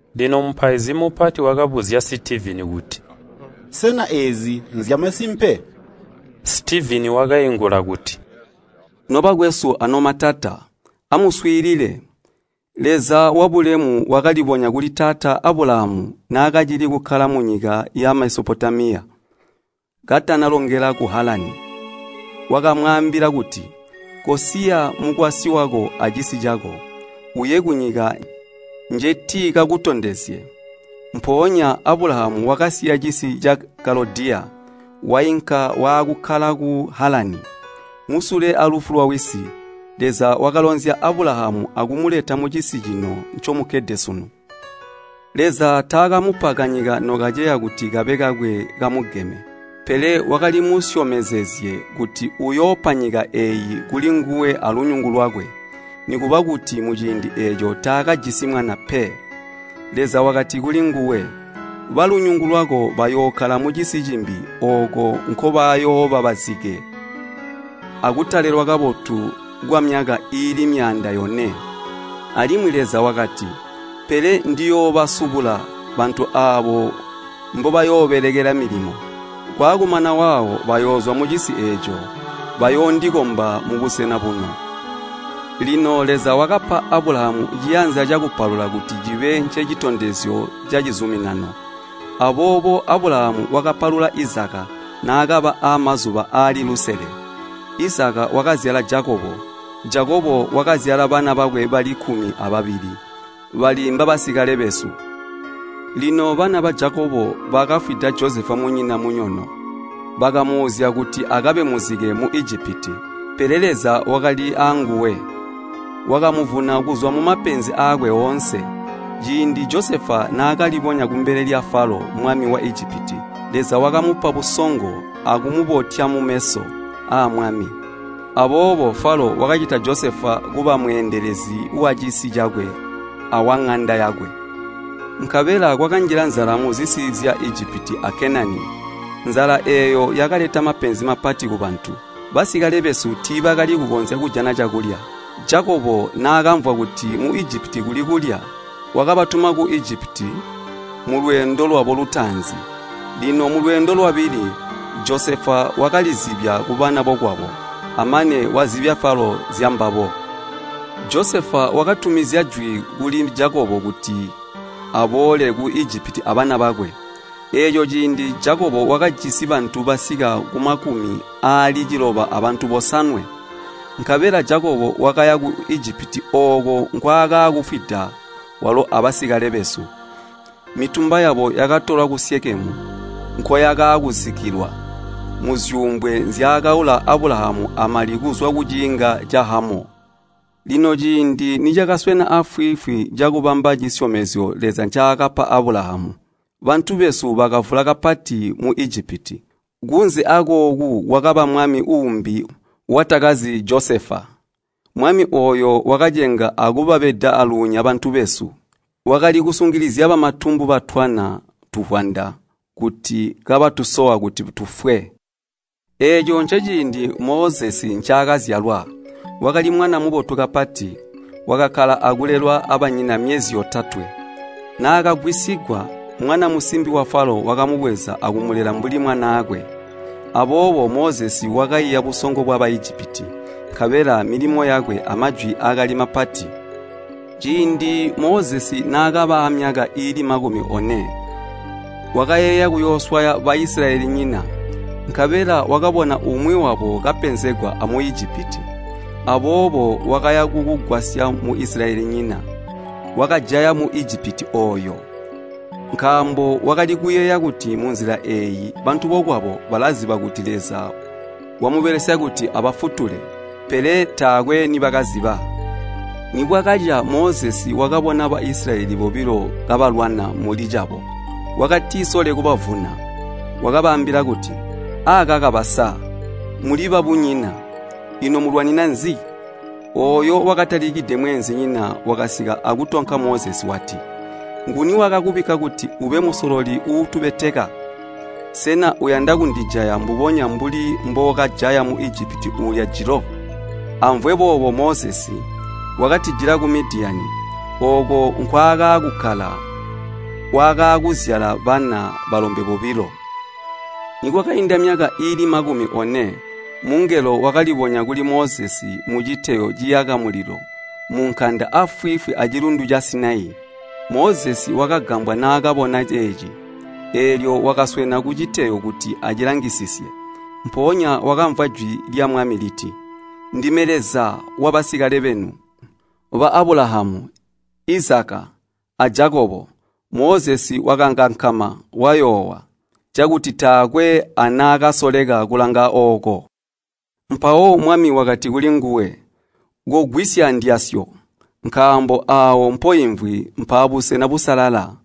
Lino mupaizi mupati wakabuzya Sitivini kuti, “Sena eezi nzyamasimpe?” Sitivini wakaingula kuti, “Nobakwesu anomatata, amuswiilile! Leza wabulemu wakalibonya kuli Taata Abulahamu naakacili kukkala munyika ya Mesopotamiya, katanalongela ku Halani. Wakamwaambila kuti, ‘Kosiya mukwasyi wako acisi cako, uye kunyika njetikakutondezye.’ Mpoonya Abulahamu wakasiya cisi ca Kalodiya, wainka waakukkala ku Halani. Musule alufu lwawisi, Leza wakalonzya Abulahamu akumuleta mucisi cino ncomukkede sunu. Leza taakamupa kanyika nokaceya kuti kabe kakwe kamugeme. Pele wakalimusyomezezye kuti uyoopa nyika eeyi kuli nguwe alunyungu lwakwe, nikuba kuti muciindi eeco taakajisi mwana pe. Leza wakati kulinguwe, ‘Balunyungu lwako bayookkala mucisi cimbi ooko nkobayooba bazike akutalelwa kabotu kwamyaka iili myaanda yone.’ Alimwi Leza wakati, ‘Pele ndiyoobasubula bantu aabo mbobayoobelekela milimo. Kwaakumana waawo bayoozwa mucisi eeco, bayoondikomba mubusena buno.’ Lino Leza wakapa Abulahamu ciyanza cakupalula kuti cibe ncecitondezyo cacizuminano. Aboobo Abulahamu wakapalula Izaka naakaba aamazuba aali lusele, Izaka wakapalula Jakobo, Jakobo wakapalula bana bakwe bali kkumi ababili, bali mbabasikale besu. “Lino bana ba Jakobo bakafwida Josefa munyina munyono, bakamuuzya kuti akabe muzike mu Ijipiti. Pele Leza wakali aanguwe, wakamuvuna kuzwa mumapenzi aakwe oonse. Ciindi Josefa naakalibonya kumbele lya Falo mwami wa Ijipiti, Leza wakamupa busongo akumubotya mumeso aamwami. Aboobo Falo wakacita Josefa kuba mweendelezi wacisi cakwe awaŋanda yakwe. Nkabela kwakanjila nzala muzisi zya Ijipiti a Kenani, nzala eeyo yakaleta mapenzi mapati kubantu. Basikale besu tiibakali kukonzya kujana cakulya. Jakobo naakamvwa kuti mu Ijipiti muli kulya, wakabatuma ku Ijipiti mulweendo lwabo lutaanzi. Lino mulweendo lwabili, Josefa wakalizibya kubana bokwabo, amane wazibya Falo zyambabo. Josefa wakatumizya jwi kuli Jakobo wisi kuti aboole ku Ijipiti abana bakwe. Eeco ciindi Jakobo wakajisi bantu basika kumakumi aali ciloba abantu bosanwe. Nkabela Jakobo wakaya ku Ijipiti ooko nkwaakaakufwida walo abasikale besu. Mitumba yabo yakatolwa ku Syikemu, nkoyakaakuzikkilwa muzyuumbwe nzyaakaula Abulahamu amali kuzwa kuciinga ca Hamoo. “Lino ciindi nicakaswena aafwiifwi cakubamba cisyomezyo Leza ncaakapa Abulahamu, bantu besu bakavula kapati mu Ijipiti. Kunze akooku kwakaba mwami uumbi watakazi Josefa. Mwami ooyo wakacenga akubabeda aalunya bantu besu. Wakali kusungilizya bamatumbu batwana tuvwanda kuti kabatusowa kuti tufwe. Eeco nceciindi Mozesi ncaakazyalwa. Wakali mwana mubotu kapati, wakakkala akulelwa abanyina myezi yotatwe, naakagwisigwa, mwana musimbi wa Falo wakamubweza akumulela mbuli mwanaakwe. Aboobo Mozesi wakaiya busongo bwa Baijipiti, nkabela milimo yakwe amajwi akali mapati. “Ciindi Mozesi naakaba aamyaka iili makumi one, wakayeeya kuyooswaya Baisilayelinyina. Nkabela wakabona umwi wabo kapenzegwa a Muijipiti. Aboobo wakaya kukugwasya Muisilayelinyina, wakajaya Muijipiti ooyo. Nkaambo wakali kuyeeya kuti munzila eeyi bantu bokwabo balaziba kuti Leza wamubelesya kuti abafutule. Pele taakwe nibakaziba. Nibwakaca Mozesi wakabona Baisilayeli bobilo kabalwana mulicabo. Wakatisole kubavuna, wakabaambila kuti, ‘Akaka basa, muli babunyina, ino mulwanina nzi?’ Ooyo wakatalikide mweenzinyina wakasika akutonka Mozesi wati, ‘Nguni wakakubikka kuti ube musololi uutubeteka? Sena uyanda kundijaya mbubonya mbuli mbookajaya Muijipiti uulya jilo?’ Amvwe boobo Mozesi, wakatijila ku Midiyani. Ooko nkwaakaakukkala, wakaakuzyala bana balombe bobilo. “Nikwakainda myaka iili makumi one, mungelo wakalibonya kuli Mozesi muciteyo ciyaka mulilo munkanda aafwiifwi acilundu ca Sinai. Mozesi wakagambwa naakabona ceeci, eelyo wakaswena kuciteyo kuti acilangisisye. Mpoonya wakamvwa jwi lya Mwami liti, ‘Ndime Leza wabasikale benu, ba Abulahamu, Izaka, a Jakobo.’ Mozesi wakakankama wayoowa, cakuti taakwe anaakasoleka kulanga ooko. Mpawo Mwami wakati kulinguwe, ‘Kogwisya ndyasyo, nkaambo aawo mpoimvwi mpaabusena busalala.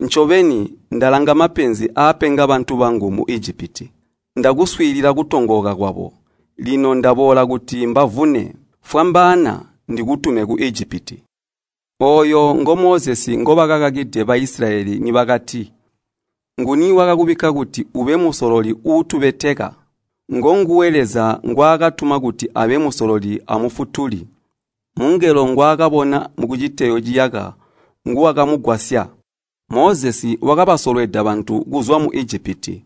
Ncobeni, ndalanga mapenzi aapenga bantu bangu mu Ijipiti. Ndakuswiilila kutongooka kwabo, lino ndaboola kuti mbavune. Fwambaana, ndikutume ku Ijipiti.’ “Ooyu ngo Mozesi ngobakakakide Baisilayeli nibakati, ‘Nguni wakakubikka kuti ube musololi uutubeteka?’ Ngonguwe Leza ngwaakatuma kuti abe musololi amufutuli. Mungelo ngwaakabona kuciteyo ciyaka nguwakamugwasya. Mozesi wakabasolweda bantu kuzwa mu Ijipiti.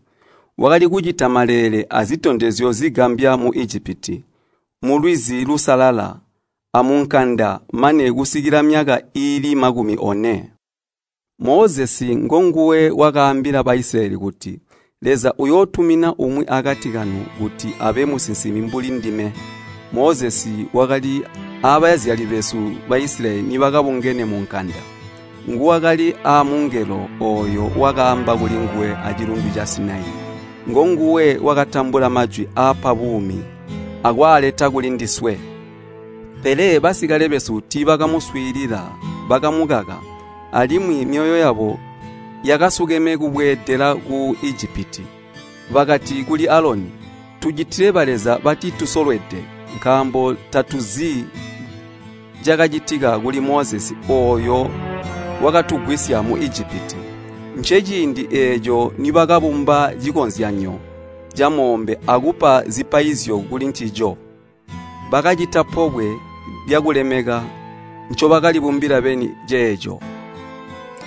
Wakali kucita maleele azitondezyo zigambya mu Ijipiti, mu Lwizi Lusalala, amunkanda mane kusikila myaka iili makumi one. Mozesi ngonguwe wakaambila Baisilayeli kuti, ‘Leza uyootumina umwi akati kanu kuti abe Musinsimi mbuli ndime.’ Mozesi wakali aabazyali besu Baisilayeli nibakabungene munkanda. Nguwakali aamungelo ooyo wakaamba kulinguwe acilundu ca Sinai. Ngonguwe wakatambula majwi aapa buumi akwaaleta kulindiswe. “Pele basikale besu tiibakamuswiilila, bakamukaka, alimwi myoyo yabo yakasukeme kubweedela ku Ijipiti. Bakati kuli Aloni, ‘Tucitile baleza batitusolwede, nkaambo tatuzi cakacitika kuli Mozesi ooyo wakatugwisya mu Ijipiti.’ Nceciindi eeco nibakabumba cikozyanyo camoombe akupa zipaizyo kulincico. Bakacita pobwe lyakulemeka ncobakalibumbila beni ceeco.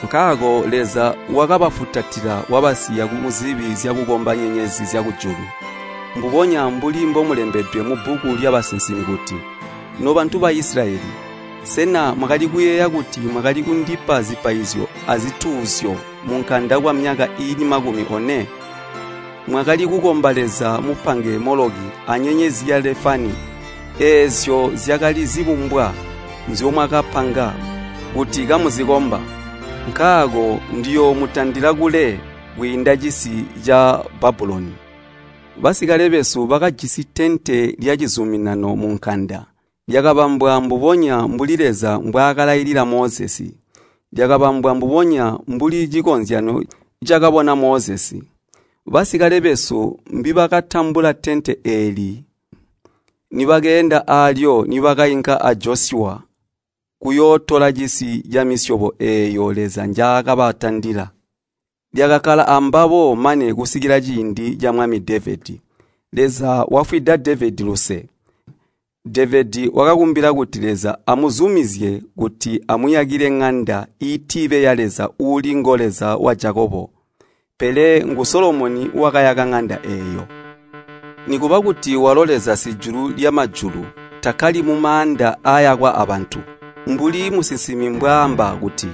Nkaako Leza wakabafutatila wakabasiya muzibi zyakukomba nyenyezi zyakujulu, mbubonya mbuli mbokulembedwe mubbuku lyabasinsimi kuti, ‘Nobantu ba Isilayeli! Sena mwakali kuyeeya kuti mwakali kundipa zipaizyo azituuzyo munkanda kwamyaka iili makumi one? Mwakali kukomba leza mupange Moloki anyenyezi ya Lefani. Eezyo zyakali zibumbwa nzyomwakapanga kuti kamuzikomba. Nkaako ndiyoomutandila kule kwiinda cisi ca Babuloni.’ “Basikale besu bakajisi tente lyacizuminano munkanda. Lyakabambwa mbubonya mbuli Leza mbwaakalailila Mozesi. Lyakabambwa mbubonya mbuli cikozyanyo cakabona Mozesi. Basikale besu mbibakatambula tente eeli ndibakeenda aalyo nibakainka a Josyuwa kuyootola cisi camisyobo eeyo Leza njaakabatandila. Lyakakkala ambabo mane kusikila ciindi ca mwami Devedi. Leza wafwida Devedi luse. Devedi wakakumbila kuti Leza amuzumizye kuti amuyakile ŋanda iitibe ya Leza uuli ngo Leza wa Jakobo. Pele ngu Solomoni wakayaka ŋanda eeyo. “Nikuba kuti walo Leza Sijulu lyamajulu takkali mumaanda aayakwa abantu, mbuli musinsimi mbwaamba kuti,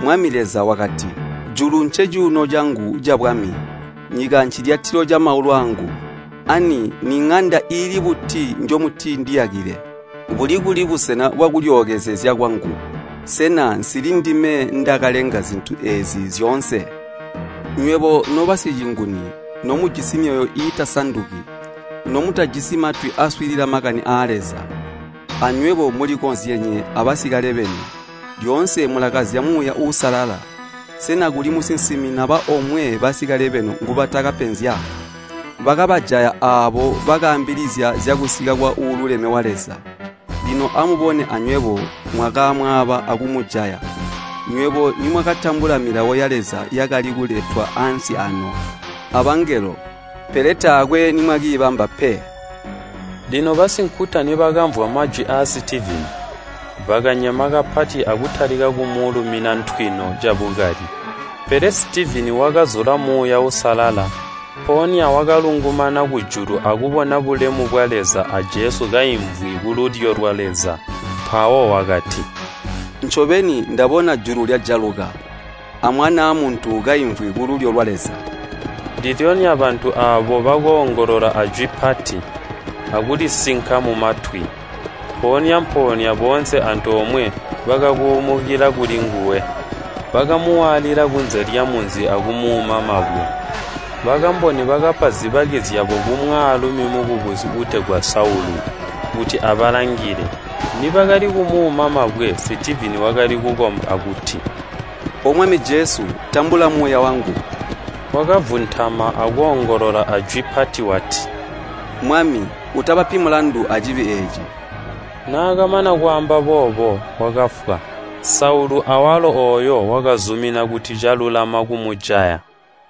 ‘Mwami Leza wakati, Julu ncecuuno cangu cabwami, nyika ncilyatilo camaulu aangu. Ani niŋanda iili buti njomutindiyakile? Buli kuli busena bwakulyookezezya kwangu? Sena nsili ndime ndakalenga zintu eezi zyoonse?’ “Nywebo nobasicinguni! Nomujisi myoyo iitasanduki! Nomutajisi matwi aaswiilila makani aa Leza! Anywebo mulikozyenye abasikale benu, lyoonse mulakazya Muuya Uusalala. Sena kuli musinsimi naba omwe basikale benu ngubatakapenzya? Bakabajaya aabo bakaambilizya zyakusika kwa Uululeme wa Leza. Lino amubone anywebo mwakamwaaba akumujaya. Nywebo nimwakatambula Milawo ya Leza yakali kuletwa ansi aano abangelo, pele taakwe nimwakiibamba pe!” Lino basinkuta nibakamvwa majwi aa Sitivini, bakanyema kapati akutalika kumulumina ntwino cabukali. Pele Sitivini, wakazula Muuya Uusalala, mpoonya wakalungumana kujulu akubona bulemu bwa Leza a Jesu kaimvwi kululyo lwa Leza. Mpawo wakati, “Ncobeni! Ndabona julu lyajaluka, a Mwanaa Muntu kaimvwi kululyo lwa Leza!” Ndilyonya bantu aabo bakoongolola ajwi pati, akulisinka mumatwi. Mpoonya-mpoonya boonse antoomwe bakakuumukila kulinguwe. Bakamuwaalila kunze lyamunzi akumuuma mabwe. Bakamboni bakapa zibaki zyabo kumwaalumi mukubusi uutegwa Saulu, kuti abalangile. Nibakali kumuuna mabwe, Sitivini wakali kukomba akuti, “O Mwami Jesu, tambula muuya wangu!” Wakavuntama akoongolola ajwi pati wati, “Mwami, utabapi mulandu acibi eeci!” Naakamana kwaamba boobo wakafwa. Saulu awalo ooyo wakazumina kuti calulama kumujaya.